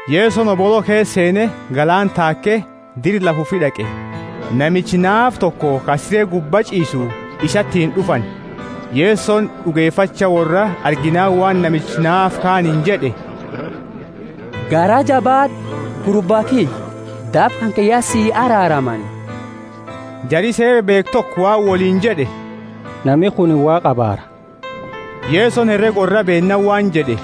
Yesoni hobolo keesa seene galaana taake, dira lafa ufi d'aqe. Namicha naafa toko ka sire gubba ch'iisu isatiini d'ufani. Yesoni d'ugefacha worraa arginaani waan namicha naafa kaaniini jed'e, Garaa jabaad'u, gurba kiyya; daba kanke ya sii araaramani. Jari Seera beekhu toko waan woliini jed'e, Nami kunini Waaqa abaara! Yesoni herega worraa beennaani waan jed'e,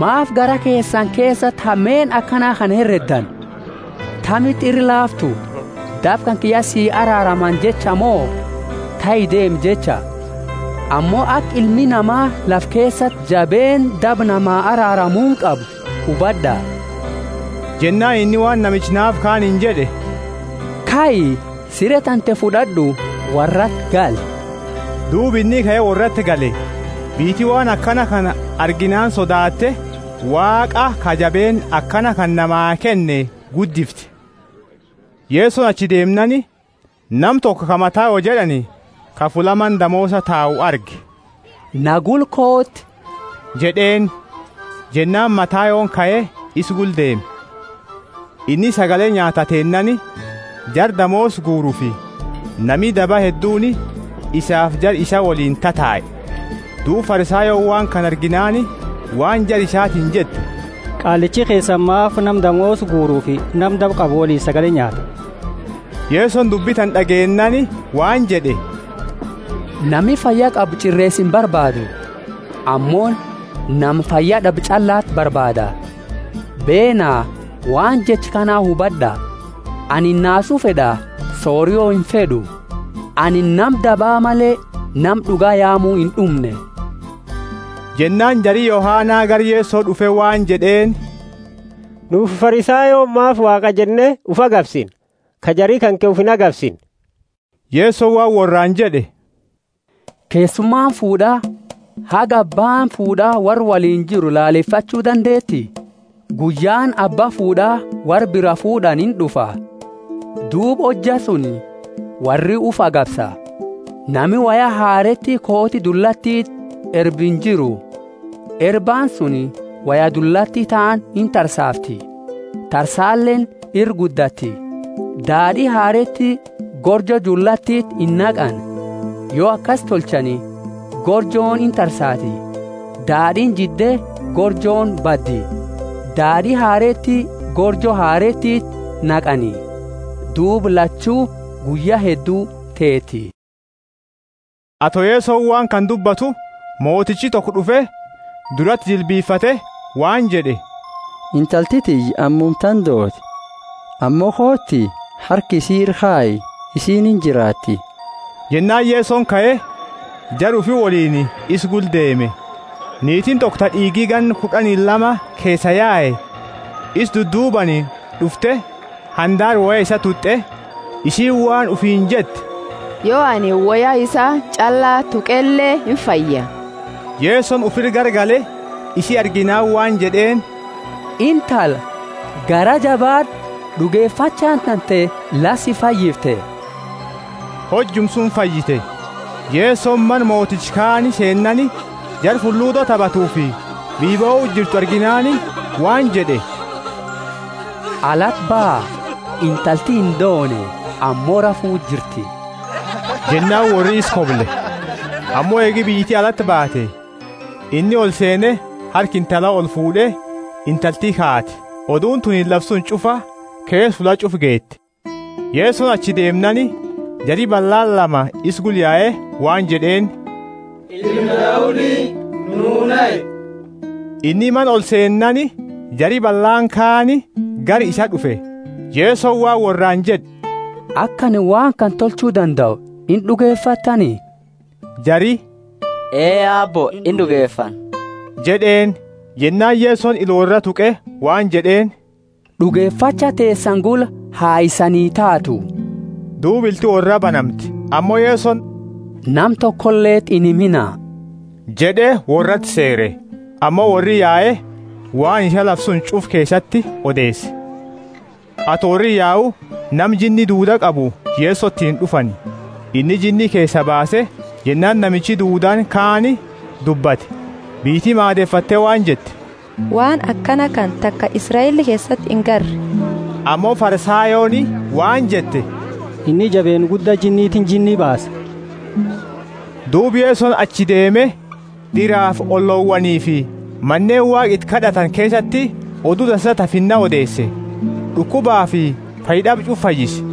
Maafi garaa keesani keesati hameenna akana kana hereddani? Tamiti ira laaftu, Daba kanke ya si araaramani jecha mo, kai deemi jecha? Ammo aka Ilmi Nama lafa keesati jabeenna daba nama araaramuuni qabu hubad'a. Jennaani inni waan namicha naafa kaaniini jed'e, Kai, sire tante fud'ad'u, worrati gali. Duuba inni kae worrati gale. Biyyiti waan kana arginaani sodaate, Waaqa ka jabeenna akana kana namaa kenne guddifte. Yesoni achi deemnaani, nama toko ka Matayo jed'ani, ka fulla mana damoosa tau arge, Na gula kooti jed'eeni. Jennaani Matayoni kae, isa gula deeme. Inni sagale nyaataa teennaani, jara damoosa guurufi nami daba hedduuni isaafi jara isaa woliini tatae. Duuba Farisayooni waan kana arginaani waan jara isatiini jette, Qaallichi keesani maafi nama damoosa guurufi nama daba qabu woliini sagale nyaata? Yesoni dubbi tana d'ageennaani waan jed'e, Nami fayya qabu ch'ireesa imbarbaadu, ammo nama fayyad'abe ch'allati barbaada. Beena, waan jecha kana hubad'a, Anini naasu fed'a, sorio imfed'u. Anini nama daba male, nama d'uga yaamu ind'umne. Jennaani jari Yohana gara Yeso d'ufe waan jed'eeni, Nuufi Farisayooni maafi Waaqaa jenne ufi agabsina, ka jari kanke ufi inagabsine? Yesoni waan worraani jed'e, Keessumaani fuud'aa haga abbaani fuud'a worra woliini jiru lalefachu dandeeti? Guyyaani abba fuud'a worra biraa fuud'ani ind'ufa, duuba hojja suni worri ufi agabsa. Nami woya hareeti kooti dullatiti erbu injiru; erbaani suni woya dullati taani intarsaafti, tarsaaleeni ira guddatti. Daad'i hareeti gorjo dullatiti inaqani. Yo akasi tolchani, gorjooni intarsaati, daad'iini jidde gorjooni baddi. Daad'i hareeti gorjo hareetiti naqani, duuba lachu guyya heddu teeti. Ato Yesoni waan kana dubbatu, motichi toko d'ufe, durati jilbifate waan jed'e, Intalti tiyya ammumatana doote; ammo kooti, harka isi ira kayi, isiini injiraatti. Jennaani Yesoni kae, jara ufi woliini isa gula deeme. Niitiini toko, ta d'iigi ganna kud'ani lama keesaa yae, isa duddaduubaani d'ufte, handaara woya isaa tut'e. Isiini waan ufiini jette, Yo anini woya isaa ch'alla tuqele imfaya. Yesoni ufira garagale, isi arginaani waan jed'eeni, Intala, garaa jabaad'u, d'ugefachaani tante la si fayyifte. Hojuma suni fayyite. Yesoni mana moticha kaani seennaani jara fuludo tabatufi biyya bohu jirtu arginaani waan jed'e, Alati baha, intalti indoone, ammo rafu jirti. Jennaani worri isa koble, ammo, eegi biyyiti alati baate, inni olseene harka intala olfuud'e, intalti kaate. Oduuni tunini lafa suni ch'ufa keesa fulla ch'ufa geete. Yesoni achi deemnaani jari ballaani lama isa gula yae waan jed'eeni, Ilma Daudi, nuu nahi. Inni mana olseennaani jari ballaani kaani gara isaa d'ufe. Yesoni waan worraani jed'e, Aka anini waan kana tolchu dandau ind'ugefattani? Jari, Ee Aabbo ind'ugefanna jed'eeni. Jennaani Yesoni ila worra tuqe waan jed'eeni, D'ugefacha teesani gula ha isanii taatu. Duuba ilti worra banamte, Ammo Yesoni nama tokoleti inhimina jed'e, worrati seere. Ammo worri yae, waan isaa lafa suni ch'ufa keesati odeese. Ato worri yau nama jinni duuda qabu Yesotiini d'ufani. Inni jinni keesaa baase jennaani namichi duudaani kaani dubbate. Biyyiti maadefatte waan jette, Waan akana kana taka Israeli keesati ingarre. Ammo Farisayooni waan jette, Inni jabeenna gudda jinnitiini jinni baasa. Duuba Yesoni achi deeme diraafi ollowaanifi maneeni Waaqa iti kad'atani keesati Odu Dansa ta Finna odeese, d'ukubafi fayyad'aba ch'ufa fayyise.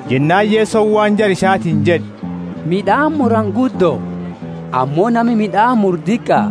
Jennaani Yesoni waan jara isatiini jed'e, Mid'aani murani guddo, ammo nami mid'aani muru diqa.